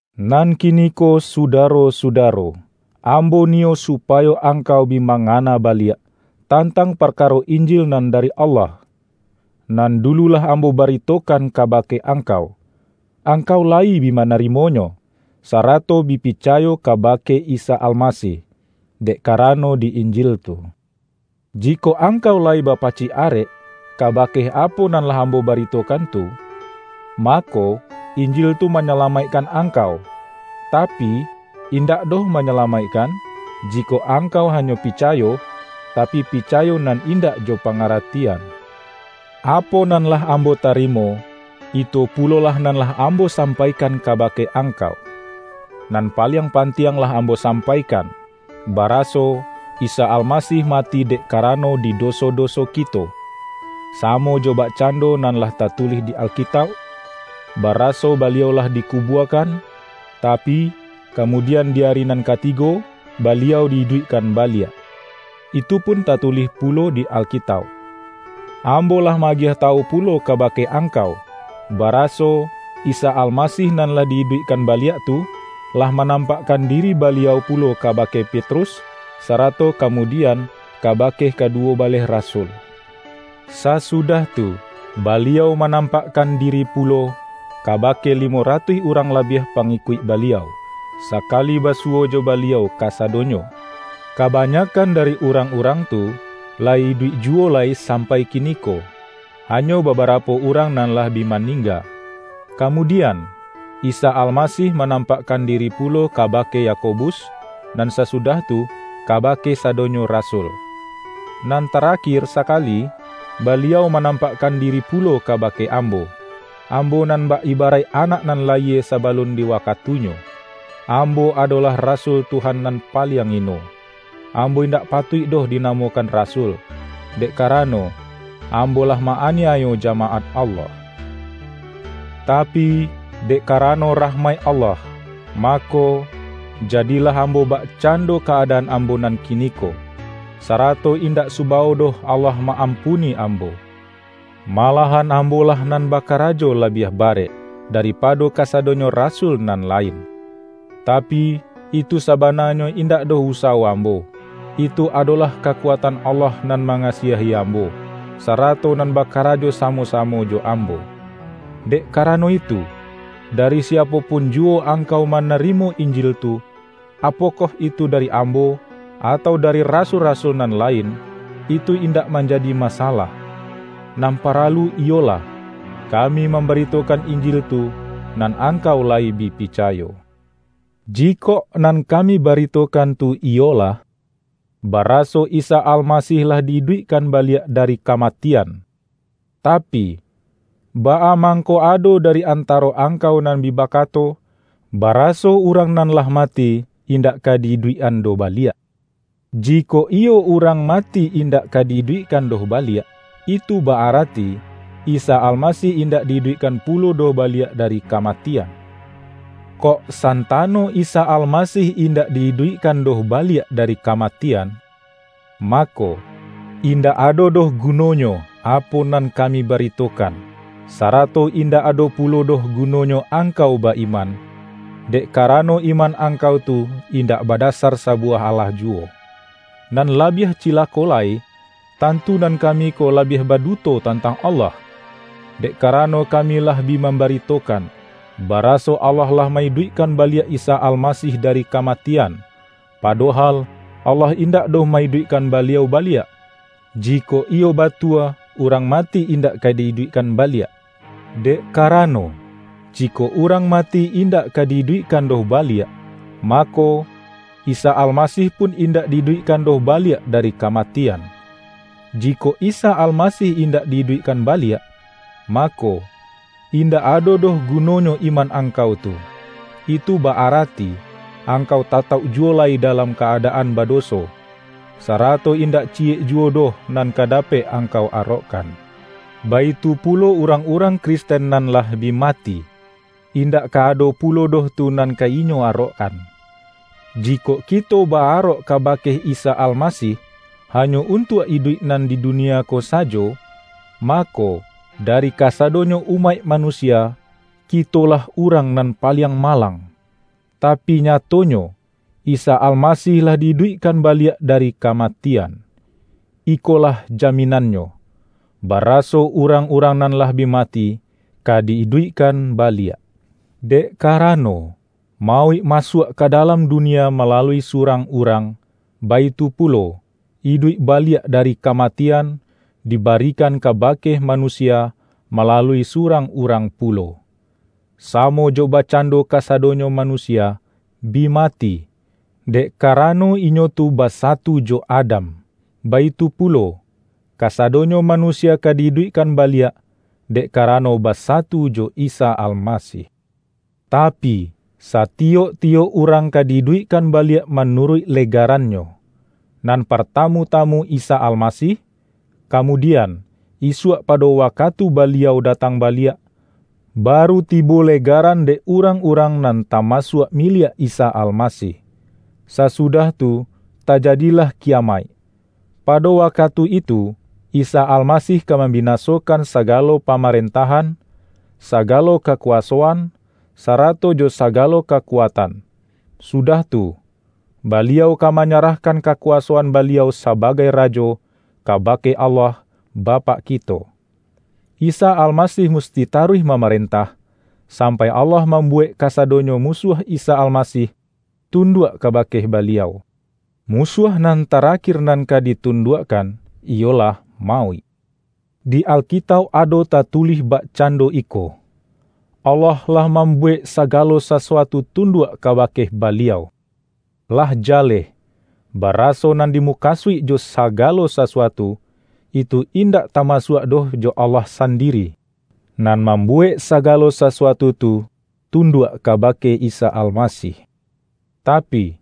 Nan kiniko sudaro-sudaro, am-bo niyo supayo angkau bi ma-ngana baliak, tantang parkaro Injil nan dari Allah, nan dulu lah ambo bari-tokan kabake angkau. Angkau layi bi manarimonyo, sarato bi picayo kaba-ke Isa Almasih, dek karano di Injil tu. Jikok angkau layi bapacik arek, ka-bake apo nan lah ambo baritokan tu, mako, Injil tu manyalamaikkan ang-kau; tapi, indak doh manyalamaikkan, jikok angkau hanyo picayo, tapi pica-yo nan indak jo pangaratian. Apo nan lah ambo tarimo, itu pu-lolah nan lah ambo sampaikan kaba-ke angkau. Nan paliang pantiang lah ambo sampaikan, baraso, Isa Alma-sih mati dek karano di doso-doso ki-to, samo jo bakcando nan lah tatulih di Alkitauk; baraso Baliau lah diku-buakan, tapi, kamudian di ari nan ka-tigo, Baliau di-iduikkan baliak. Itupun tatulih pulo di Alkitauk. Ambo lah ma-agiah tawu pulo kabake angkau, baraso, Isa Almasih nan lah di-iduik-kan baliak tu, lah manampakkan diri Baliau pulo kabake Petrus, sarato ka-mudian, kabake kaduwo baleh rasul. Sasudah tu, Baliau manampakkan diri pulo, kabake limo ratuih urang labiah pangikuik Baliau, sakali basu-wo jo Baliau kasadonyo. Kabanyak-kan dari urang-urang tu, layi iduik ju-wo lai sampai kiniko, hanyo babarapo urang nan lah bi maningga. Kamu-dian, Isa Almasih manampakkan di-ri pulo kabake Yakobus, nan sasudah tu, kabake sadonyo rasul. Nan tarakir sakali, Baliau manam-pakkan diri pulo kabake ambo, - ambo nan bak ibaraik anak nan layie saba-lun di waktunyo! Ambo adolah ra-sul Tuhan nan paliang ino. Ambo in-dak patuik doh dinamokan rasul, dek karano, ambo lah ma-aniayo jamaat Allah. Tapi, dek karano rahmaik Allah, mako, jadilah ambo bakcan-do ka-adaan ambo nan kiniko. Sarato indak subawo doh Allah ma-ampuni ambo. Malahan ambolah nan baka-rajo labiah barek, daripado kasado-nyo rasul nan lain. Tapi, itu sabana-nyo indak doh usawo ambo; itu adolah kakuatan Allah nan mangasiahi am-bo, sarato nan bakarajo samo-samo jo ambo. Dek karano itu, dari si-apo pun juwo angkau manarimo Injil tu, -apokoh itu dari ambo, atau dari rasul-rasul nan lain - itu indak man-jadi masalah. Nan paralu iyolah, ka-mi mambaritokan Injil tu, nan ang-kau layi bi picayo. Jikok nan kami baritokan tu iyo-lah, baraso Isa Almasih lah di-iduikkan baliak dari kamatian, tapi, baa mang-ko ado dari antaro angkau nan bi ba-kato, baraso urang nan lah mati, in-dak ka di-iduikkan doh baliak? Jikok iyo urang mati indak ka di-iduikkan doh baliak, itu ba-arati, Isa Almasih indak di-iduikkan pulo doh baliak dari kamatian. Kok santano Isa Almasih indak di-iduikkan doh baliak dari ka-matian, mako, indak ado doh guno-nyo apo nan kami baritokan, sarato indak ado pulo doh gunonyo angkau ba-iman, dek karano iman angkau tu indak badasar sabuwah alah juwo. Nan labiah cilako lai, tantu nan ka-mi ko lah bi baduto tantang Allah, dek karano kami lah bi mambaritokan, ba-raso Allah lah ma-iduikkan baliak Isa Almasih dari kamatian, padohal, Allah indak doh ma-iduikkan Baliau baliak -jikok iyo batua urang mati indak ka di-iduikkan baliak! Dek karano, jikok urang mati indak ka di-iduikkan doh baliak, mako, Isa Almasih pun indak di-iduikkan doh baliak dari kamatian. Jikok Isa Almasih indak di-iduikkan baliak, mako, indak ado doh gunonyo iman angkau tu; itu ba-arati, angkau tatauk juwo lai dalam ka-adaan bado-so, sarato indak ciyek juwo doh nan ka dapek angkau arokkan. Baitu pulo urang-urang Kristen nan lah bi mati, indak ka ado pulo doh tu nan ka inyo arokkan. Jikok kito ba-arok kabake Isa Almasih, hanyo untuak iduik nan di dunia ko sajo, mako, dari kasadonyo umaik manusia, kitolah urang nan pa-liang malang! Tapi nyatonyo, Isa Almasih lah di-iduikkan baliak dari kamatian. Iko-lah jaminannyo, baraso urang-urang nan lah bi mati, ka di-iduikkan baliak. Dek karano, mauik masuak ka dalam dunia malalui surang urang, baitu pu-lo, iduik baliak dari kamatian, dibari-kan kabake manusia, malalui surang urang pulo. Samo jo bakcando ka-sadonyo manusia, bi mati, dek kara-no inyo tu basatu jo Adam, baitu pulo, kasadonyo manusia ka di-iduikkan ba-liak, dek karano basatu jo Isa Almasih. Tapi, satiyok-tiyok urang ka di-iduikkan baliak manuruik legaran-nyo: nan partamu-tamu Isa Almasih; kamudian, isuak pado wakatu Baliau datang baliak, baru tibo legaran dek urang-urang nan tamasuak miliak Isa Almasih. Sasudah tu tajadilah kiya-maik. Pado wakatu itu, Isa Almasih ka mambinasokan sagalo pamaren-tahan, sagalo kakuwasoan, sarato jo sagalo kakuatan; sudah tu, Baliau ka manyarahkan kakuwasoan Baliau sa-bagai Rajo, kabake Allah, Bapak kito. Isa Almasih musti taruih mamaren-tah, sampai Allah mambuwek kasa-donyo musuah Isa Almasih, tunduak kabake Baliau. Musuah nan tarakir nan ka ditunduakkan, iyolah mauik. Di Alkitauk ado tatulih bakcando iko, ’Allah lah mambuwek sagalo sa-suatu tunduak kabake Baliau.” Lah ja-leh, baraso nan dimukasuik jo”saga-lo sasuatu,” itu indak tamasuak doh jo Allah sandiri, nan mambuwek sa-galo sasuatu tu, tunduak kabake Isa Almasih. Tapi,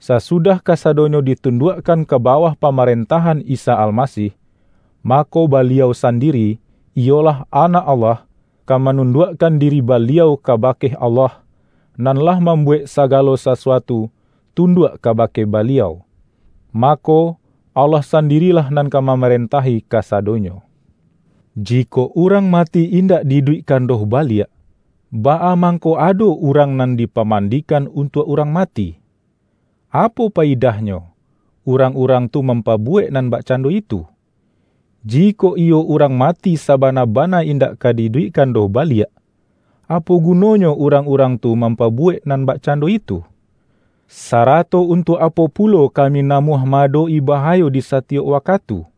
sasudah kasadonyo ditunduakkan ka bawah pamarentah-an Isa Almasih, mako Baliau sandiri, iyolah Anak Allah, ka manunduakkan diri Baliau kabake Allah, nan lah mam-buwek sagalo sasuatu tunduak kaba-ke Baliau. Mako, Allah sandirilah nan ka mamarentahi kasadonyo. Jikok urang mati indak di-iduik-kan doh baliak, baa mangko ado urang nan dipamandikan untuak urang ma-ti? Apo payidahnyo urang-urang tu mampabuwek nan bakcando itu? Ji-kok iyo urang mati sabana-bana indak ka di-iduikkan doh baliak, apo guno-nyo urang-urang tu mampabuwek nan bakcando itu? Sarato untuak apo pulo kami namuah ma-adok-i baha-yo di satiyok wakatu?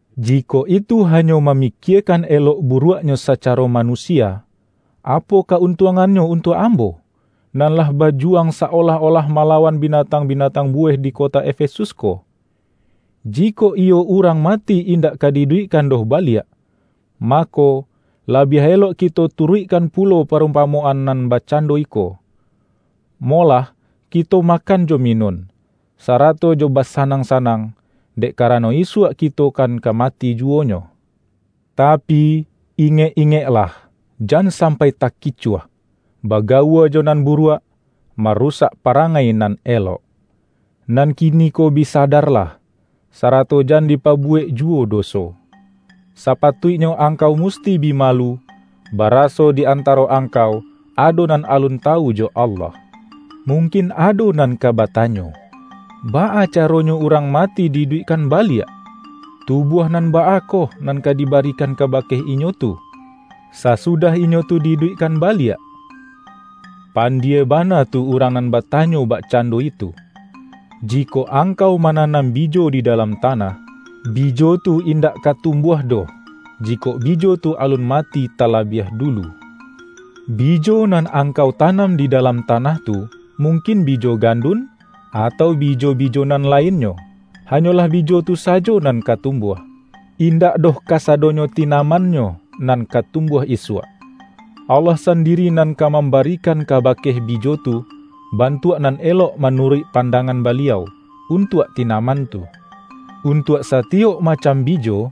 Jikok itu hanyo mamikiekan elok buruak sacaro ma-nusia, apo ka-untuangannyo untuak ambo, nan lah bajuwang sa-olah-olah malawan binatang-binatang buweh di kota Efesus ko? Jikok iyo urang ma-ti indak ka di-iduikkan doh baliak, mako, labiah elok kito turuikkan pu-lo parumpamoan nan bakcando iko:”Molah kito makan jo minun, sarato jo basanang-sanang, dek karano isuak kito kan ka mati juwonyo.” Tapi, ingek-ingeklah, jan sampai takicuah! Bagawua jo nan buruak, ma-rusak parangai nan elok. Nan kini-ko bi sadarlah, sarato jan dipabuwek juwo doso. Sapatuiknyo angkau musti bi malu, baraso di antaro angkau ado nan alun tawu jo Allah. Mungkin ado nan ka batanyo,”Baa caronyo urang mati di-iduikkan ba-liak? Tubuah nan baa koh nan ka di-barikan kabake inyo tu, sasudah inyo tu di-iduikkan baliak?" pandie bana tu urang nan batanyo bakcando itu! Jikok angkau mananam bijo di dalam tanah, bijo tu indak ka tumbuah doh, jikok bijo tu alun mati talabiah dulu. Bijo nan angkau tanam di dalam ta-nah tu - mungkin bijo gandun, atau bijo-bijo nan lainnyo - hanyolah bijo tu sajo nan ka tumbuah, indak doh ka-sadonyo tinamannyo nan ka tumbuah isuak. Allah sandiri nan ka mam-barikan kabake bijo tu, bantuak nan elok manuruik pandangan Baliau, un-tuak tinaman tu. Untuak satiyok ma-cam bijo,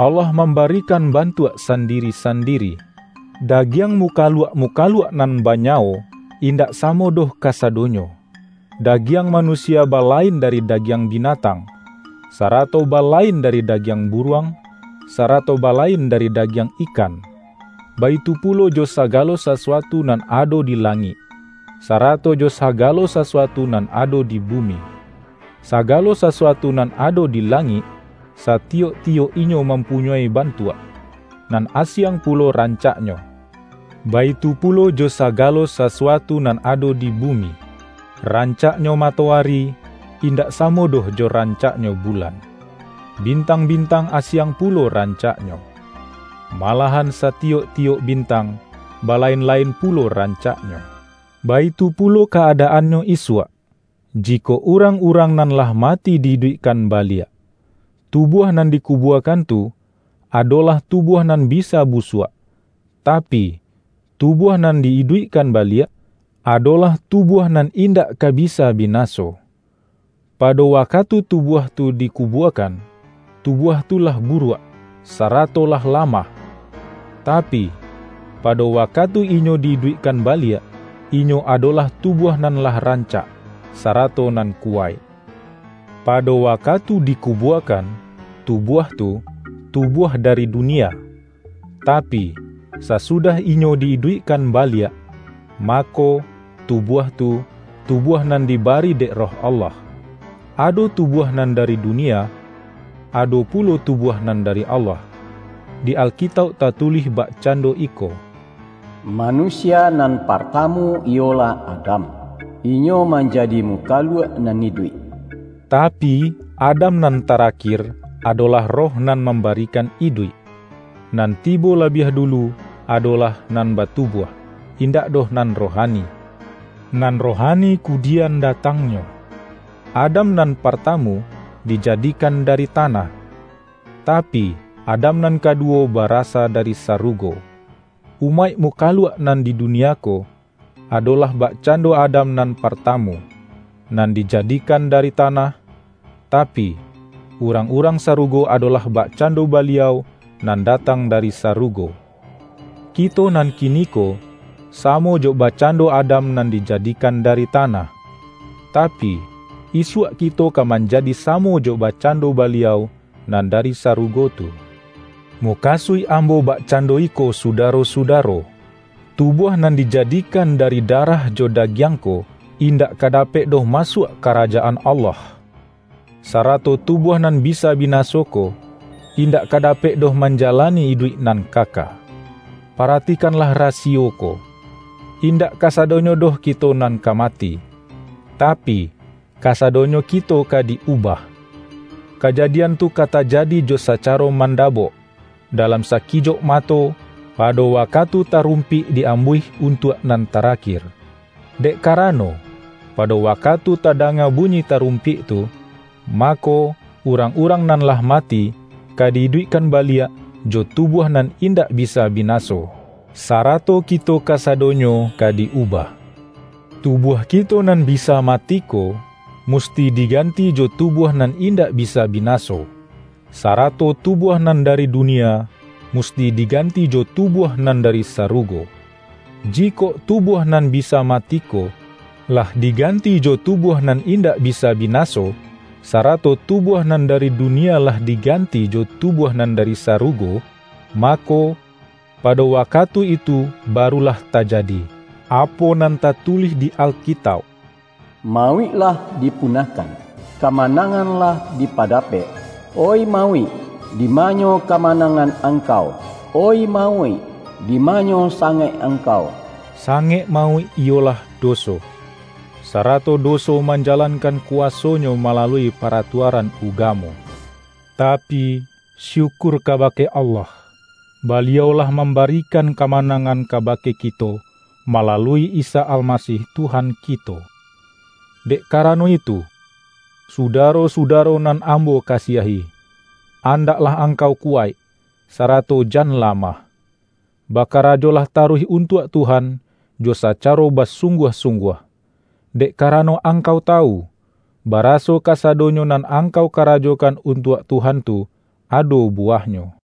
Allah mambarikan bantuak sandiri-sandiri. Dagiang mukaluak-mukaluak nan banyawo, indak samo doh kasadonyo. Dagiang manusia balain dari dagiang binatang, sarato balain dari dagiang buruang, sarato balain dari dagiang ikan. Baitu pulo jo sagalo sasuatu nan ado di langik, sarato jo sagalo sasuatu nan ado di bumi. Sagalo sasuatu nan ado di langik, satiyok-tiyok inyo mam-punyoi bantuak, nan asiang pulo ran-caknyo, baitu pulo jo sagalo sasuatu nan ado di bumi. Rancaknyo mato-ari, indak samo doh jo rancaknyo bu-lan. Bintang-bintang asiang pulo ran-caknyo. Malahan satiyok-tiyok bintang, balain-lain pulo rancaknyo. Baitu pulo ka-adaannyo isuak, ji-kok urang-urang nan lah mati di-iduik-kan baliak. Tubuah nan dikubuakan tu, adolah tubuah nan bisa busuak, tapi, tubuah nan di-iduikkan baliak, adolah tubuah nan indak ka bisa bi-naso. pado wakatu tubuah tu diku-buakan, tubuah tu lah buruak, sarato lah lamah; tapi, pado wakatu inyo di-iduikkan baliak, inyo adolah tubuah nan lah rancak, sarato nan kuwaik. Pado wakatu dikubuakan, tubuah tu, tubuah dari dunia; tapi, sasudah inyo di-iduikkan baliak, mako, tubuah tu, tubuah nan dibari dek Roh Allah. Ado tubuah nan dari dunia, ado pulo tubuah nan dari Allah. Di Alkitauk tatulih bakcando iko,”Manusia nan partamu, iyolah Adam, inyo manjadi mukaluak nan iduik,” tapi, Adam nan tarakir, adolah Roh nan mambarikan iduik. Nan tibo labiah dulu, adolah nan batubuah, indak doh nan rohani. Nan rohani kudian datangnyo. Adam nan partamu, dijadikan dari tanah, ta-pi, Adam nan kaduwo barasa dari sa-rugo. Umaik mukaluak nan di dunia ko, adolah bakcando Adam nan par-tamu, nan dijadikan dari tanah, tapi, urang-urang sarugo adolah bakcando Baliau nan datang dari sarugo. Kito nan kiniko, samo jo bakcando Adam nan dijadikan dari tanah, tapi, isuak ki-to ka manjadi samo jo bakcando Baliau nan dari sarugo tu. Mukasuik ambo bakcando iko su-daro-sudaro: tubuah nan dijadikan da-ri darah jo dagiang ko, indak ka dapek doh masuak Karajaan Allah; sarato tu-buah nan bisa binaso ko, indak ka da-pek doh manjalani iduik nan kaka. Paratikanlah rasiyo ko: Indak kasa-donyo doh kito nan ka mati, tapi, kasa-donyo kito ka di-ubah. Kajadian tu ka tajadi jo sacaro mandabok, dalam saki-jok mato, pado wakatu tarumpik di-am-buih untuak nan tarakir. Dek karano, pado wakatu tadanga bunyi tarumpik tu, mako, urang-urang nan lah mati, ka di-iduikkan baliak jo tubuah nan indak bisa binaso, sarato kito kasadonyo ka di-ubah. Tubuah kito nan bisa mati ko, musti diganti jo tubuah nan indak bisa binaso, sarato tubuah nan dari dunia, musti diganti jo tubuah nan dari saru-go. Jikok tubuah nan bisa mati ko, lah diganti jo tubuah nan indak bisa binaso, sarato tubuah nan dari dunia lah diganti jo tubuah nan dari sarugo, mako, pado wakatu itu barulah tajadi, apo nan tatu-lih di Alkitauk,”Mauik lah dipunahkan; kamanangan lah dipadapek!” ”Oih mauik, dimanyo kamanangan angkau? Oih mauik, dimanyo sangek angkau?” Sangek mauik iyolah doso, sa-rato doso manjalankan kuwasonyo malalui paratuaran ugamo. Tapi, syukur kabake Allah; Baliau lah mambarikan kamanangan kabake kito, malalui Isa Almasih Tuhan kito! Dek karano itu, sudaro-sudaro nan ambo kasiahi, andaklah angkau kuwaik, sarato jan lamah. Bakarajolah taruih untuak Tuhan jo sacaro basung-guah-sungguah, dek karano angkau tawu, baraso kasadonyo nan angkau karajokan untuak Tuhan tu, ado bu-wahnyo.